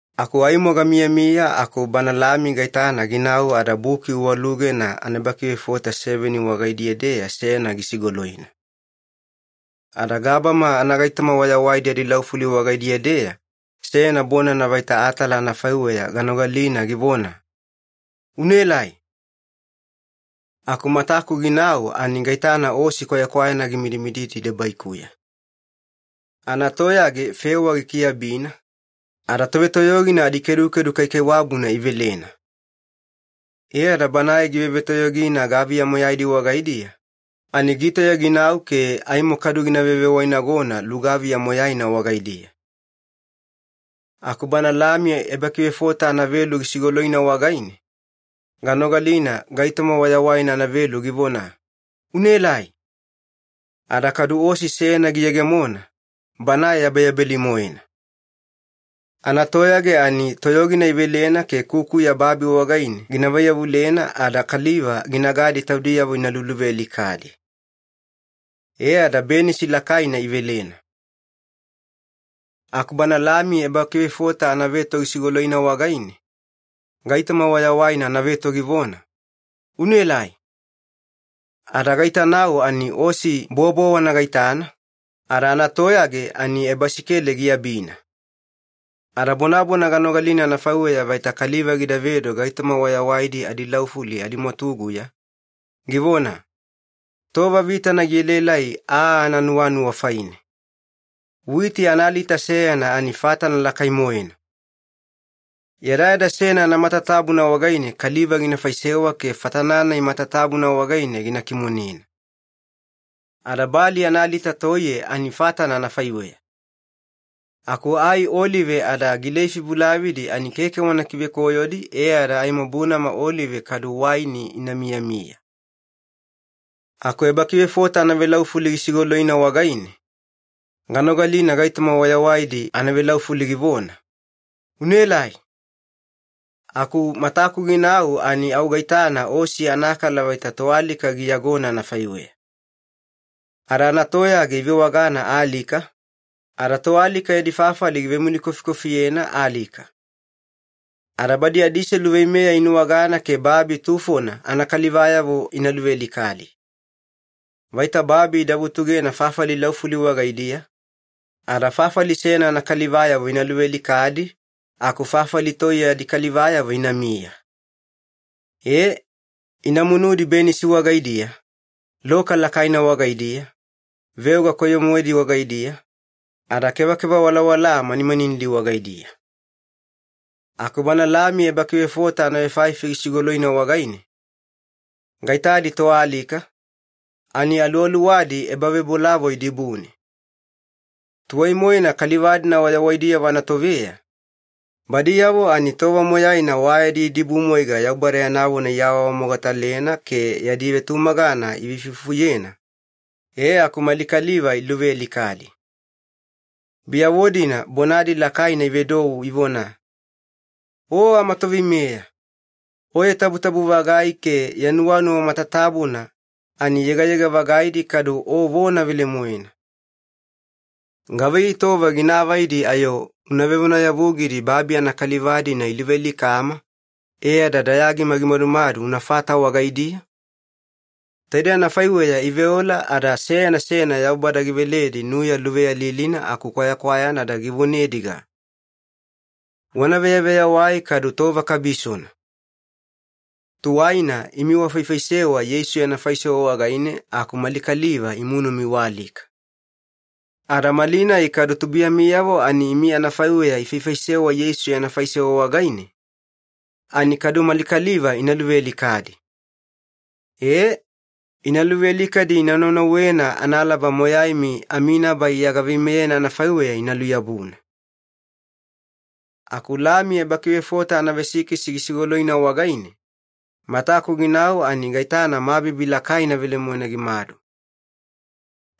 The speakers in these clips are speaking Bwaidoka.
Aku aimo gamiyamiya aku Bana Lami gaitana ginau ada buki uwalugena anaebakivefota seveni wagaidiya-deya, seyana gisigoloina. Ada gabama anagaitoma wayawaidi adilaufuli wagaidiya-deya seyana bonana vaita atala anafaiweya ganogalina givona, “Unaelai!” Aku mataku ginau ani gaitana osi kwayakwayana gimidimididi debaikuya. Anatoyage fewa gikiyabina, ada tovetoyogina adikedukedu kaikaiwabuna ivelena. E ada banae givevetoyogina gaviya moyaidi wagaidiya, ani gitauya ginau ke aimo kadu gina vevewainagona lugaviya moyaina wagaidiya. Aku Bana Lami ebakivefota anavelu gisigoloina wagaine, ganogalina gaitoma wayawaina anavelu givona, “Unaelai!” Ada kadu osi seyana giyegemona, banae yabeyabeli-moena. Anatoyage ani toyogina ivelena ke kukuya babi wagaine gina vaiyavulena ada kaliva ginagadi taudiyavo ina luluvealikadi. E ada benisi lakaina ivelena. Aku Bana Lami ebakivefota anaveto gisigoloina wagaine, gaitoma wayawaina anaveto givona, “Unaelai!” Ada gaitanau ani osi bowabowana gaitana, ada anatoyage ani ebasikele giabina. Ada bonabona ganogalina anafaiweya vaita kaliva gidavedo gaitoma wayawaidi adilaufuli adimwatuguya, givona, “Tova vitana gielaelai aa ananuwanuwa faine. Witi analita seyana ani fatana lakai-moena! Yadayada seyana anamatatabuna wagaine kaliva gina faisewa ke fatana-nai matatabuna wagaine gina kimonena. Ada bali analita toiye ani fatana anafaiweya. Aku ai olive ada gileifi bulavadi ani keke wana kivekoyodi e ada aimo bunama olive kadu waini ina miyamiya.” Aku ebakivefota anavelaufuli gisigoloina wagaine, ganogalina gaitoma wayawaidi anavelaufuli givona, “Unaelai!” Aku mataku ginau ani au gaitana osi anakala vaita toalika giyagona anafaiweya. Ada anatoyage ivewagana Alika, ada Toalika yadi Fafali givemulikofikofiyena Alika. Ada badi adiselu veimeya inuwagana ke babi tufona anakalivayavo ina luvealikadi. Vaita babi ida vutugena fafali laufuli wagaidiya, ada fafali seyana anakalivayavo ina luvealikadi aku fafali toiye adikalivayavo inamiya. Ee, ina munudi benisi wagaidiya, loka lakaina wagaidiya, veoga koyo-moedi wagaidiya, ada kevakeva walawala manimaninidi wagaidiya. Aku Bana Lami ebakivefota anavefaifi gisigoloina wagaine, gaitadi toalika, ani aluwaluwadi ebavebolavoi dibune. Tuwai-moena kaliva-dina wayawaidiyavo anatoveya, badiyavo ani tova moyaina wa yadi idibumwaiga Yaubada yana vona iawaawamogatalena ke yadi vetumagana iifuifufuyena, e aku mali kaliva iluvealikadi. Biyavo-dina bonadi lakaina ivedou ivona, “O amaToveimeya, Oye tabutabu-vagai ke ya nuwanuwa matatabuna ani yegayega-vagaidi kadu O vona velemoena. Gavaiyei tova gina avaidi ayo una vevonayavugidi babi anakaliva-dina iluvealikama, e ada dayagima gimadumadu unafata wagaidiya?” Taidei anafaiweya iveola ada seyana seyana Yaubada giveledi nuya luveyalilina aku kwayakwayana ada givonediga, “Wana veyaveyawai kadu tova kabisona. Tuwaina imi wafaifaisewa Yeisu yana faisewa wagaine aku mali kaliva imunumi waalika. Ada malinai kadu tubuiyamiyavo ani imi anafaiweya ifaifaisewa Yeisu yana faisewa wagaine, ani kadu mali kaliva ina luvealikadi. E, ina luvealikadi ina naunauwena analaba moyaimi aminaba Iya gaveimeyena anafaiweya ina luyabuna.” Aku Lami ebakivefota anavesikisi gisigoloina wagaine, mataku ginau ani gaitana mabibi lakaina velemoena gimadu.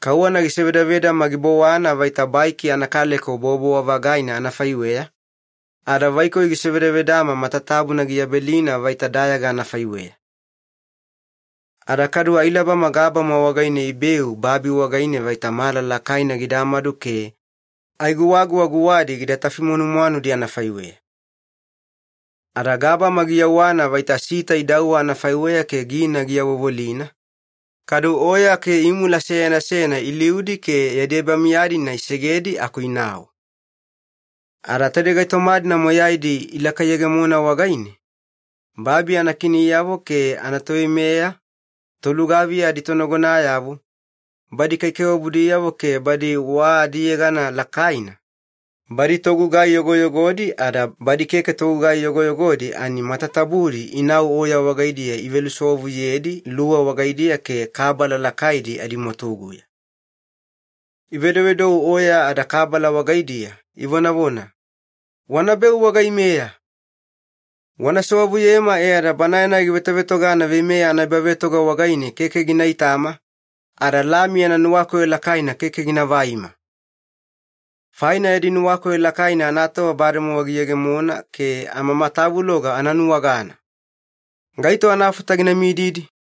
Kauwana gisevedavedama gibowana vaita baiki anakaleko bowabowa-vagaina anafaiweya, ada vaikoi gisevedavedama matatabuna giyabelina vaita dayaga anafaiweya. Ada kadu ailabama gabama wagaine ibeu babi wagaine vaita mala lakaina gidamadu ke ai guwaguwa guwadi gida tafimwanumwanudi anafaiweya. Ada gabama giauwana vaita sita idauwa anafaiweya ke gina giavovolina, kadu oya ke imula seyana seyana iliudi ke yadi ebamiya-dina isegedi aku inau. Ada taide gaitoma-dina moyaidi ilakayegemona wagaine, babi anakiniyavo ke anatoveimeya, tolugaviya aditonagonayavo, badi kaikaiwabudiyavo ke badi wa adiyegana lakaina, badi togugai yogoyogodi ada badi keke togugai yogoyogodi ani matatabudi inau oya wagaidiya ivelusewavuyedi luwa wagaidiya ke kabala lakaidi adimwatuguya. Ivedovedou oya ada kabala wagaidiya, ivonavona, “Wanabeu wagaimeya! Wana sewavuyema e ada Banae-nai givetovetogana veimeya anaebavetoga wagaine keke gina itama, ada Lami yana nuwakoyo lakaina keke gina vaima. Faina yadi nuwakoyo lakaina anatova bademowa giyegemona ke amamatavuloga ana nuwagana! Gaito anafata gina mididi?”